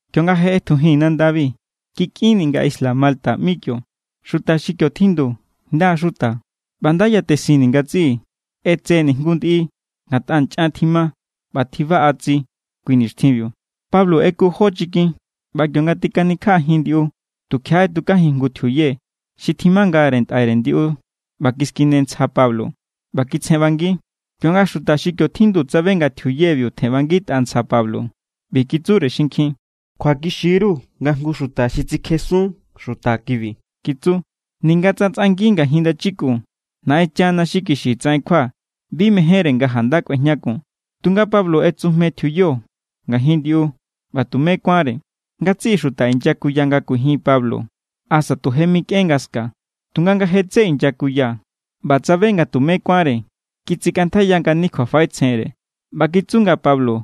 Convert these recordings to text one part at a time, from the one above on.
Kionga je ꞌetjujii̱n nandabi, kikꞌinni̱ nga isla Malta ꞌmi kio. Xuta xi kio tjindu nda= xuta ꞌba nda yatesinni̱ ngatsiꞌi. ꞌEtseni̱ jngu ndiꞌi, ngatꞌa nchꞌan tjima ꞌba tjibaꞌa tsi kui nixtjinbiu. Pablo ꞌeku jó chikin ꞌba kionga tikanikjaꞌajin ndiꞌu, tukjiaꞌa ꞌetukajin jngu tjiuye xi tjimangare ntꞌaire ndiꞌu ꞌba kiskine ntsja Pablo ꞌba kitsjenꞌbangi. Kionga xuta xi kio tjindu tsabe nga tjiuyebiu tjenꞌbangitꞌa ntsja Pablo, ꞌbi kitsure xinkjin: —Kjuakixi=ru nga jngu xuta xi tsikjesun xuta kibi —kitsu—. Ninga tsa tsꞌangi ngajin ndachikun, Naꞌenchana xi kixi tsaꞌen kjua bi mejénre nga janda kꞌuejñakun. Tunga Pablo ꞌetsujmejin tjiuyo ngajin ndiꞌu, ꞌba tumé kuánre. Ngatsiꞌi xuta inyakuya nga kuijin Pablo asa tu je mikꞌen nga ska. Tunga nga je tsé inyakuya ꞌba tsabe nga tumé kuánre, kitsikꞌantjaiya ngani kjuafaꞌetsjenre ꞌba kitsu nga Pablo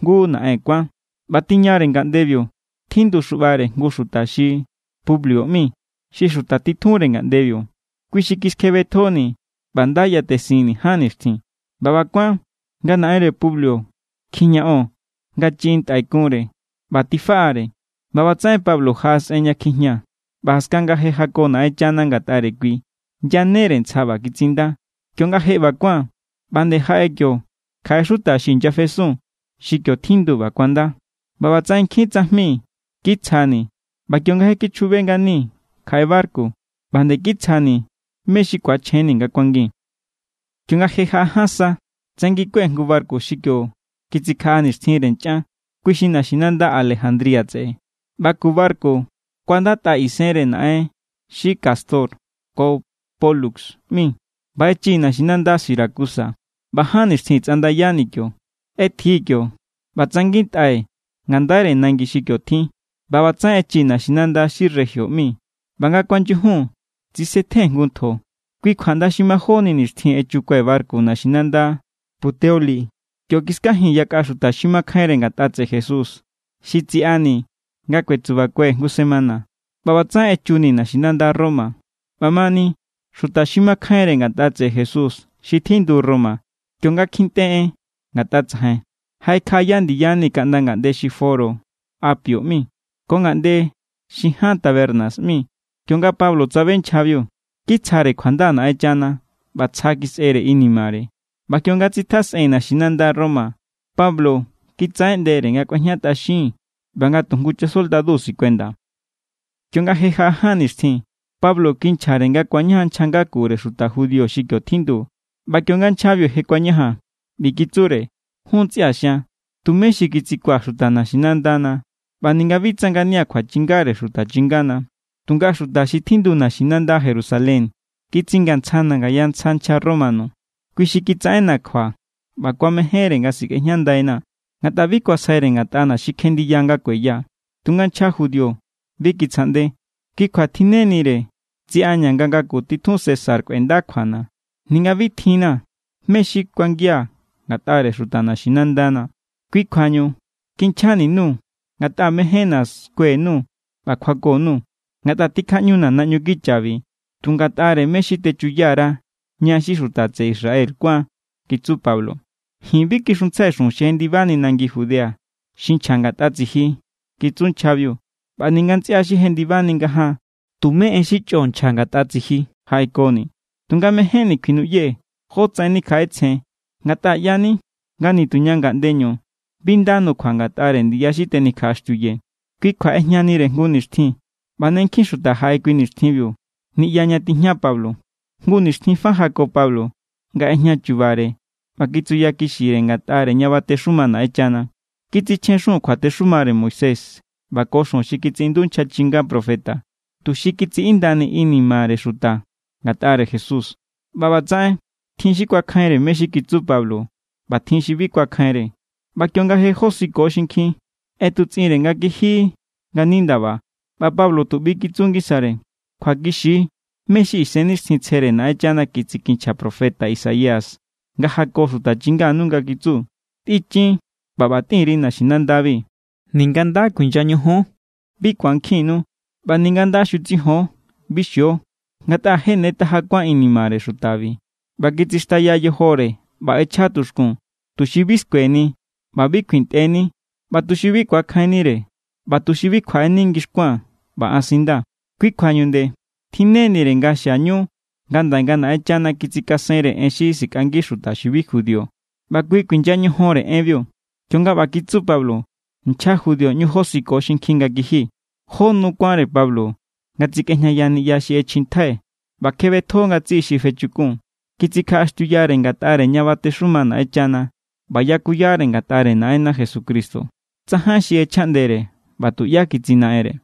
jngu naꞌen kuán. ꞌBa tiñare ngaꞌndebiu tjindu xuꞌbare jngu xuta xi Publio ꞌmi, xi xuta titjunre ngaꞌndebiu. Kui xi kiskjebetjoni̱ ꞌba nda yatesinni̱ ján nixtjin. ꞌBa ꞌba kuán, nga naꞌenre Publio kjijñaꞌon nga chiꞌin ntꞌai kunre ꞌba tifaꞌare. ꞌBa ꞌbatsaꞌen Pablo jaꞌasꞌen ña kjijña ꞌba jaskan nga je jako Naꞌenchana ngatꞌare kui, yanere ntsja ꞌba kitsinda. Kionga je ꞌba kuán, ꞌba nde jaꞌe kio kjaꞌe xuta xi inyafesun xi kio tjindu ꞌba kuanda. ꞌBa ꞌbatsaꞌen nkjin tsajmi= kitsjani̱ ꞌba kionga je kichjube nganii̱ kjaꞌe barku, ꞌba nde kitsjani̱ mé= xi ku̱achjenni̱ nga kuangii̱n. Kionga je jaꞌa ján sa, tsanginkue̱ jngu barku xi kio kitsikjaꞌa nixtjinre nchꞌan. Kui xi naxinanda Alejandría tseꞌe ꞌba ku barku kuandatꞌa isenre naꞌen xi Cástor ko Pólux ꞌmi. ꞌBa echii̱ naxinanda Siracusa ꞌba ján nixtjin tsꞌandayani̱ kio. ꞌEtjii̱ kio ꞌba tsangitꞌai̱ ngandaire nangi xi kio tjin ꞌba ꞌbatsaꞌen echii̱ naxinanda xi Regio ꞌmi. ꞌBa nga kuanyujun tsisetjen jngu ntjo, kui kjua ꞌnda xi majóni nixtjin echukue̱ barku naxinanda Puteoli. Kio kiskajii̱n yakꞌa xuta xi makjainre ngatꞌa tseꞌe Jesús xi tsiꞌani̱ nga kuetsubakue̱ jngu semana. ꞌBa ꞌbatsaꞌen echuni̱ naxinanda Roma. ꞌBamani xuta xi makjainre ngatꞌa tseꞌe Jesús xi tjindu Roma, kionga kjintꞌe en ngatꞌa tsajain, jaꞌekjaꞌaya ndiyani̱ kaꞌnda ngaꞌnde xi Foro Apio ꞌmi ko ngaꞌnde xi Ján Tabernas ꞌmi. Kionga Pablo tsabe nchjabiu, kitsjare kjuanda Naꞌenchana ꞌba tsja kisꞌere inimare. ꞌBa kionga tsitjasꞌee̱n naxinanda Roma, Pablo kitsaꞌeꞌndere nga kꞌuejñatꞌaxin ꞌba nga tu jngu chasoldadu sikuenda. Kionga je jaꞌa ján nixtjin, Pablo kinchjare nga ku̱añajan nchja ngakure xuta judío xi kio tjindu. ꞌBa kionga nchjabiu je kuañajan, ꞌbi kitsure: —Jun ntsꞌia̱ xian, tumé xi kitsikuaa̱ xuta naxinandana ꞌba ninga bi tsa ngania̱ kjuachingare xuta chingana. Tunga xuta xi tjindu naxinanda Jerusalén kitsingantsjana̱ ngaya ntsja nchja romano. Kui xi kitsaꞌenna̱ kjua ꞌba kuamejénre nga sikꞌejñandaina̱, ngatꞌa bi kuasjaire ngatꞌana̱ xi kjenndiya nga kueya. Tunga nchja judío bi kitsjaꞌnde. Kui kjua tjinnenire tsiꞌaña̱ nga ngaku titjun César kꞌuenda kjuana̱, ninga bi tjinna̱ mé= xi kuangia̱ ngatꞌare xuta naxinandana. Kui kjuañu kinchjani_nuu̱, ngatꞌa mejénna̱ skue_nuu̱ ꞌba kjuako_nuu̱. Ngatꞌa tjikjaꞌñuna̱ naꞌñu kichabi tu ngatꞌare mé= xi techuya_ra ña xi xuta tseꞌe Israel kuán kitsu Pablo. —Ji̱n bi kixuntsjai xujun xi jendibani nangi Judea, xi nchja ngatꞌa tsiji —kitsu nchjabiu—. ꞌBa ninga ntsꞌia xi jendibani ngajaan tumé en xi chꞌo nchja ngatꞌa tsiji jaꞌekoni̱. Tunga mejénni̱ kjuinuꞌyee̱ jotsaꞌen nikjaꞌetsjen, ngatꞌa ꞌya=ni nga nituña ngaꞌndeñu bi nda nukjua ngatꞌare ndiya xi tenikjaꞌaxtiuye. Kui kjua ꞌejñanire jngu nixtjin, ꞌba ne nkjin xuta jaꞌe kui nixtjinbiu niꞌya ña tijña Pablo. Jngu nixtjin fa jako Pablo nga ꞌejña chubare ꞌba kitsuyakixire ngatꞌare ña batexuma Naꞌenchana. Kitsichjen xujun kjuatexumare Moisés ꞌba ko xujun xi kitsiꞌindu nchja chinga profeta tuxi kitsiꞌindani inimare xuta ngatꞌare Jesús. ꞌBa ꞌbatsaꞌen tjin xi kuakjainre mé= xi kitsu Pablo ꞌba tjin xi bi kuakjainre. ꞌBa kionga je josiko xinkjin, ꞌetutsꞌinre nga kiji ngani ndaba ꞌba Pablo tu ꞌbi= kitsu ngisare: —Kjuakixi= mé= xi Isennixtjintsjere Naꞌenchana kitsikinchja profeta Isaías nga jako xuta chinganu nga kitsu: Tꞌichin ꞌba ꞌba tꞌin_ri naxinandabi: Ninga nda kuinya ñojon, bi ku̱ankjinnu. ꞌBa ninga nda xutsijon, bi xio. Ngatꞌa je ne taja kuán inimare xutabi, ꞌba kitsixtaya yojore ꞌba ꞌechja tuxkun, tuxi bi skueni ꞌba bi kjuintꞌeni, ꞌba tuxi bi ku̱ankjinnire, ꞌba tuxi bi kjuaꞌeni ngixkuaa̱n ꞌba an sindaa̱. ’Kui kjuañu nde tjinnenire nga xiañu ngandaꞌe nga Naꞌenchana kitsikasenre en xi sikꞌangi xuta xi bi judío. ꞌBa kui kuinya ñojon=re enbiu. Kionga ꞌba kitsu Pablo, nchja judío ꞌñu josiko xinkjin nga kiji. Jó nu kuánre Pablo nga tsikꞌejñaya niꞌya xi ꞌechjintjai ꞌba kjebetjo ngatsiꞌi xi fechukun. Kitsikjaꞌaxtiuyare ngatꞌare ña batexuma Naꞌenchana ꞌba yakuyare ngatꞌare Naꞌenna Jesucristo. Tsajain xi ꞌechjaꞌndere ꞌba tuꞌyá kitsinaꞌenre.